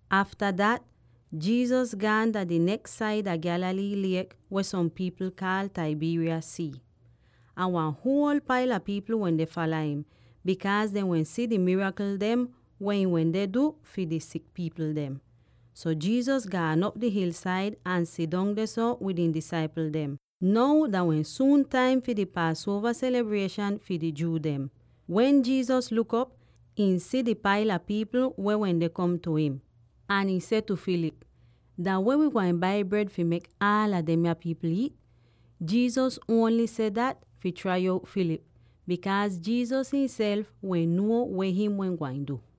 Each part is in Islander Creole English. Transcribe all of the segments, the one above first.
Afta dat, Jesus gaan dah di neks saida Galilee liek weh som pipl kaal Tiberias Sii. Ahn wan huol paila pipl wende fala im, bikaaz dehn wehn si di mirakl dem weh ihn wende du fi di sik pipl dem. So Jesus gaan op di hilsaid ahn sidong dehso wid ihn disaipl dem. Now dah wehn suun taim fi di Paasuova selibrieshan fi di Jew dem. Wen Jesus luk op, ihn si di paila pipl weh wende kom tu im. Ahn ihn seh tu Philip, “Dah weh wi gwain bai bred fi mek aala demya pipl iit?” Jesus ongl seh dat fi trai out Philip, bikaaz Jesus ihnself wehn nuo weh him wehn gwain du.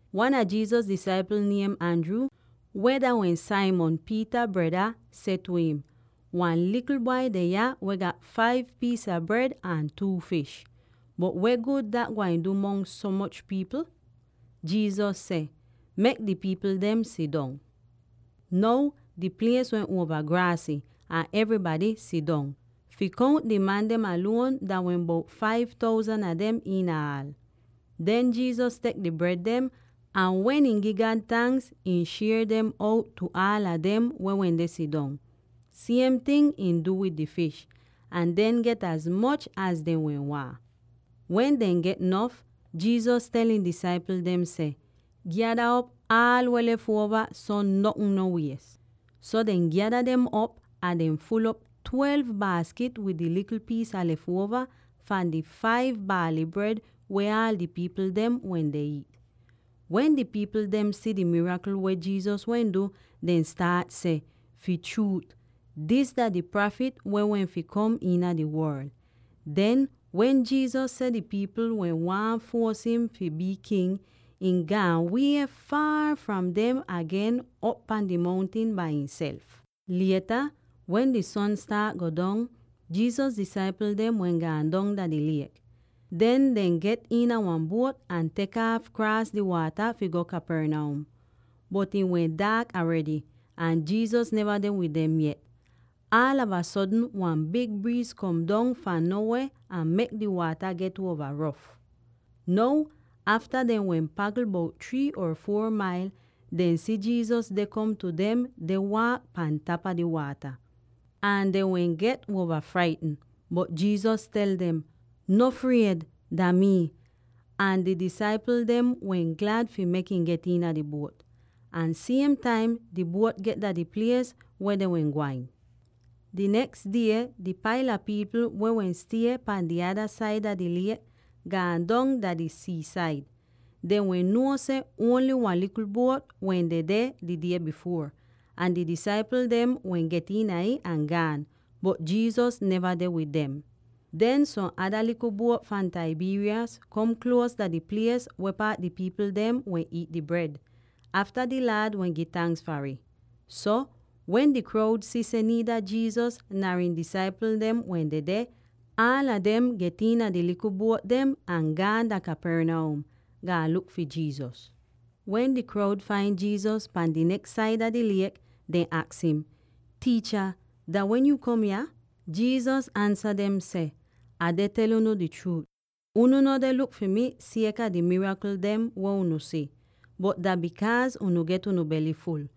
Wan a Jesus disaipl niem Andrew, weh dah wehn Simon Peter breda, seh tu im, “Wan likl bwai deh yah weh gat five piis a bred ahn two fish. Bot weh gud dat gwain du mongs so moch pipl?” Jesus seh, “Mek di pipl dem sidong.” Now di plies wehn uova graasy, ahn evrybady sidong. Fi kount di man dem aluon dah wehn bout five thousand a dem iina aal. Den Jesus tek di bred dem, ahn wen ihn gi God tanks, ihn shier dem out tu aala dem weh wende sidong; siem ting ihn du wid di fish, ahn dehn get az moch az dehn wehn waahn. Wen dehn get nof, Jesus tel ihn disaipl dem seh, “Gyada op aal weh lef uova, so notn no wies.” So dehn gyada dem op ahn dehn ful'op twelve baaskit wid di likl piis a lef uova fahn di five baaly bred weh aal di pipl dem wende iit. Wen di pipl dem si di mirakl weh Jesus wehn du, dehn staat seh, “Fi chruut, dis dah di Prafit weh wehn fi kom iina di worl!” Den, wen Jesus si seh di pipl wehn waahn fuos im fi bii king, ihn gaan weh foor fahn dem agen op pahn di mountin bai ihnself. Lieta, wen di son staat go dong, Jesus disaipl dem wehn gaan dong dah di liek. Den dehn get iina wan buot ahn tek aaf kraas di waata fi go Capernaum. Bot ih wehn daak aredy, ahn Jesus neva deh wid dem yet. Aalava sodn wan big briiz kom dong fahn no weh ahn mek di waata get uova rof. Now, afta dehn wehn pagl bout three or four mailz, dehn si Jesus deh kom tu dem deh waak pahn tapa di waata. Ahn dehn wehn get uova fraitn. Bot Jesus tel dem, “No fried. Dah mii!” Ahn di disaipl dem wehn glad fi mek im get iina di buot. Ahn siem taim di buot get dah di plies weh dehn wehn gwain! Di neks die di paila pipl weh wehn stie pahn di ada saida di liek gaan dong dah di sii-said. Dehn wehn nuo seh ongl wan likl buot wehn dedeh di die bifuor, ahn di disaipl dem wehn get iina ih ahn gaan, bot Jesus neva deh wid dem. Den som ada likl buot fahn Tiberias kom kluos dah di plies weh paat di pipl dem wehn iit di bred, afta di Laad wehn gi tanks far ih. So, wen di kroud si seh niida Jesus nar ihn disaipl dem wehn dedeh, aala dem get iina di likl buot dem ahn gaan dah Capernaum, gaan luk fi Jesus. Wen di kroud fain Jesus pahn di neks saida di liek, dehn aks im, “Tiicha, dah wen yuu kom yah?” Jesus ansa dem seh, “Ah deh tel unu di chruut: Unu no deh luk fi mii sieka di mirakl dem weh unu si, bot dah bikaaz unu get unu bely ful.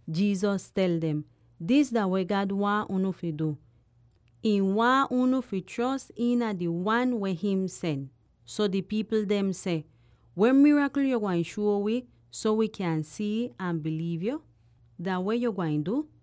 Jesus tel dem, “Dis dah weh God waahn unu fi du: ihn waahn unu fi chros iina di Wan weh him sen.” So di pipl dem seh, “Weh mirakl yo gwain shuo wi, so wi kyan si'ih ahn biliiv yo? Dah weh yuu gwain du?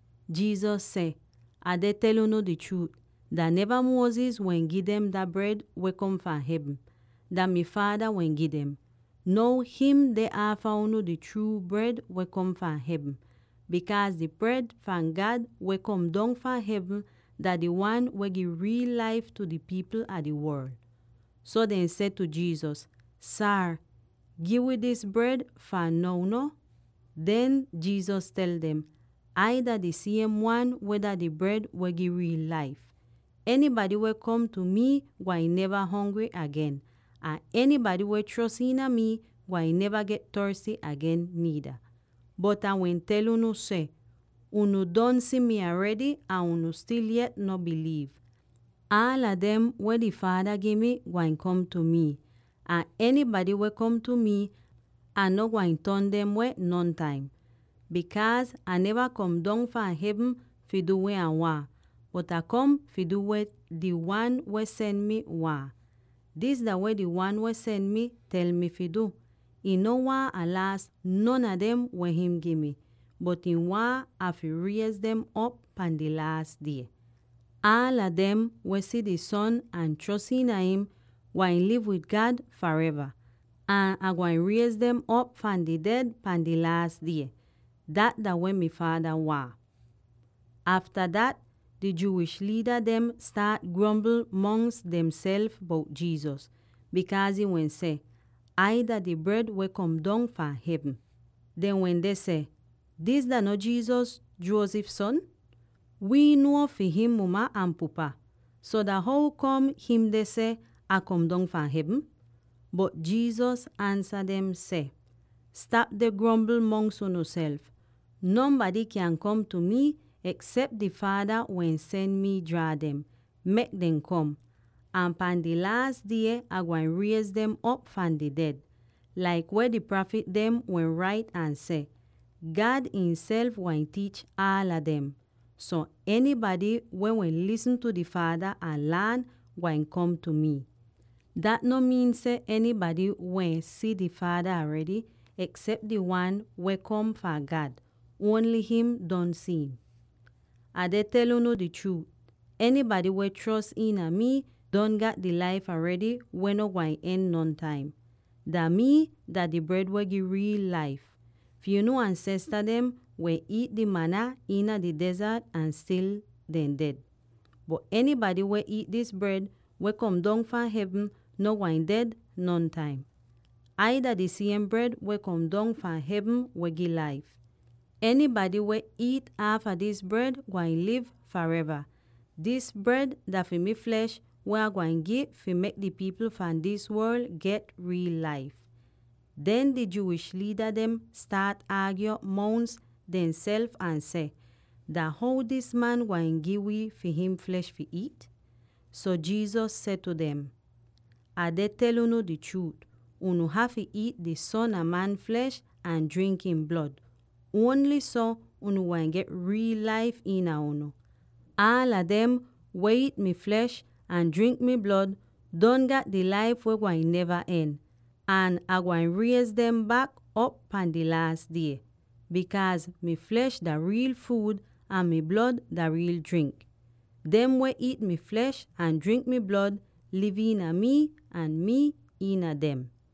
Jesus seh, “Ah deh tel unu di chruut: dah neva Moses wehn gi dem dah bred weh kom fahn hevn; dah mi Faada wehn gi dem. Now him deh aafa unu di chruu bred weh kom fahn hevn; bikaaz di bred fahn God weh kom dong fahn hevn dah di Wan weh gi riil laif tu di pipl fahn di worl.” So dehn seh tu Jesus, “Saar, gi wi dis bred fahn now no.” Den Jesus tel dem, “Ai dah di siem Wan weh dah di bred weh gi riil laif. Enybady weh kom tu mii gwain neva hongry agen, ahn enybady weh chros iina mii gwain neva get torsty agen niida. Bot Ah wehn tel unu seh: unu don si mi aredy, ahn unu stil yet no biliiv. Aala dem weh di Faada gi mi gwain kom tu mi; ahn enybady weh kom tu mi, Ah no gwain ton dem weh nontaim. Bikaaz Ah neva kom dong fahn hevn fi du weh Ah waahn, bot Ah kom fi du weh di Wan weh sen mi waahn. Dis dah weh di Wan weh sen mi tel mi fi du: ihn no waahn Ah laas non a dem weh him gi mi, bot ihn waahn Ah fi riez dem op pahn di laas die. Aala dem, weh si di Son ahn chros iina im, gwain liv wid God fareva; ahn Ah gwain riez dem op fahn di ded pahn di laas die. Dat dah weh mi Faada waahn.” Afta dat, di Jewish liida dem staat grombl mongs demself bout Jesus, bikaaz ihn wehn seh, “Ai dah di bred weh kom dong fahn hevn.” Dehn wende seh, “Dis dah no Jesus, Joseph son? Wii nuo fi him muma ahn pupa! So dah how kom him deh seh, ‘Ah kom dong fahn hevn?’” Bot Jesus ansa dem seh, “Stap deh grombl mongs unuself. Nonbady kyaahn kom tu mii, eksep di Faada weh sen mi jraa dem, mek dem kom; ahn pahn dah Laas Die Ah gwain riez dem op fahn di ded. Laik weh di prafit dem wehn rait ahn seh: ‘God ihnself gwain tiich aala dem.’ So, enybady, weh wehn lisn tu di Faada ahn laan, gwain kom tu mii. Dat no miin seh enybady wehn si di Faada aredy, eksep di Wan weh kom fahn God; ongl him don si'im. “Ah deh tel unu di chruut: enybady weh chros iina mii, don gat di laif aredy weh no gwain don nontaim ataal. Dah mii, dah di bred weh gi riil laif! Fi unu ansesta dem wehn iit di mana iina di dezart ahn stil dehn ded. Bot enybady weh iit dis bred weh kom dong fahn hevn no gwain ded nontaim. Ai dah di siem bred weh kom dong fahn hevn weh gi laif. Enybady weh iit aafa dis bred gwain liv fareva; dis bred dah fi mi flesh weh Ah gwain gi fi mek di pipl fahn dis worl get riil laif.” Den di Jewish liida dem staat aagyo mongs demself ahn seh, “Dah how dis man gwain gi wii fi him flesh fi iit?” So Jesus seh tu dem, “Ah deh tel unu di chruut: unu hafy iit di Son a Man flesh ahn jrink ihn blod; ongl so, unu gwain get riil laif iina unu. Aala dem weh iit mi flesh ahn jrink mi blod don gat di laif weh gwain neva en, ahn Ah gwain riez dem bak op pahn di laas die; bikaaz mi flesh dah riil fuud, ahn mi blod dah riil jrink. Dem weh iit mi flesh ahn jrink mi blod liv iina mii, ahn mii iina dem.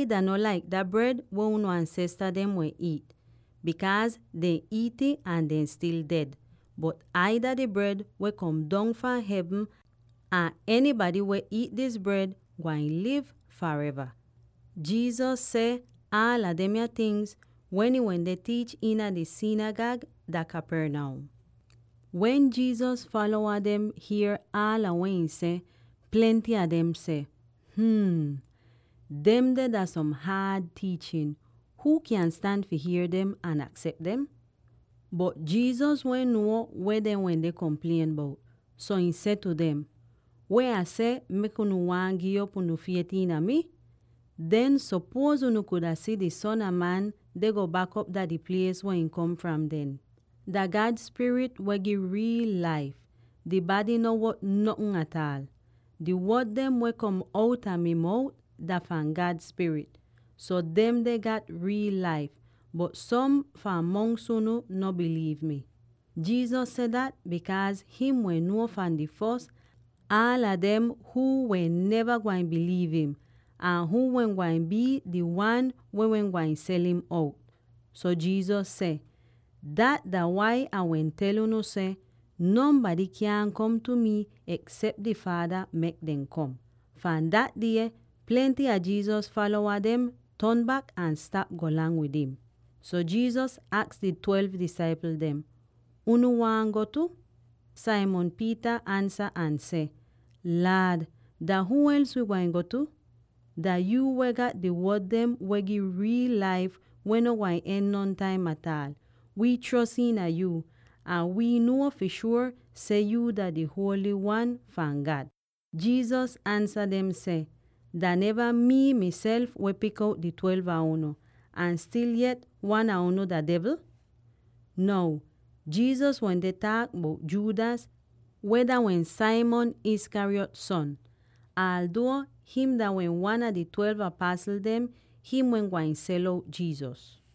Ai dah no laik dah bred weh unu ansesta dem wehn iit, bikaaz dehn iit'ih ahn dehn stil ded. Bot Ai dah di bred weh kom dong fahn hevn, ahn enybady weh iit dis bred gwain liv fareva.” Jesus seh aala demya tingz wen ihn wende tiich iina di sinigag dah Capernaum. Wen Jesus falowa dem hier aala weh ihn seh, plenty a dem seh, “Hm, demde dah som haad tiichin. Huu kyan stan fi hier dem ahn aksep dem?” Bot Jesus wehn nuo weh dehn wende komplien bout, so ihn seh tu dem, “Weh Ah seh mek unu waahn gi'op unu fiet iina mi? Den sopuoz unu kuda si di Son a Man deh go bak op dah di plies weh ihn kom fram den? Dah God Spirit weh gi riil laif; di bady no wot notn ataal. Di wod dem weh kom outa mi mout dah fahn God Spirit, so demde gat riil laif! Bot som fahn mongs unu no biliiv mi.” Jesus seh dat bikaaz him wehn nuo fahn di fos aala dem huu wehn neva gwain biliiv im, ahn huu wehn gwain bii di wan weh wehn gwain sel'im out. So Jesus seh, “Dat dah wai Ah wehn tel unu seh nonbady kyaahn kom tu mii eksep di Faada mek dem kom.” Fahn dah die, plenty a Jesus falowa ton bak ahn stap golang wid im. So Jesus aks di twelve disaipl dem, “Unu waahn go tu?” Simon Peter ansa ahn seh, “Laad, dah huu els wi gwain tu? Dah yuu weh gat di wod dem weh gi riil laif weh no gwain don nontaim ataal. Wii chros iina yu, ahn wii nuo fi shuor seh yuu dah di Holy Wan fahn God.” Jesus ansa dem seh, “Dah neva mii miself weh pik out di twelve a unu, ahn stil yet wan a unu dah devl?” Now, Jesus wende taak bout Judas weh dah wehn Simon Iscariot son. Alduo him dah wehn wan a di twelve apasl dem, him wehn gwain sel out Jesus.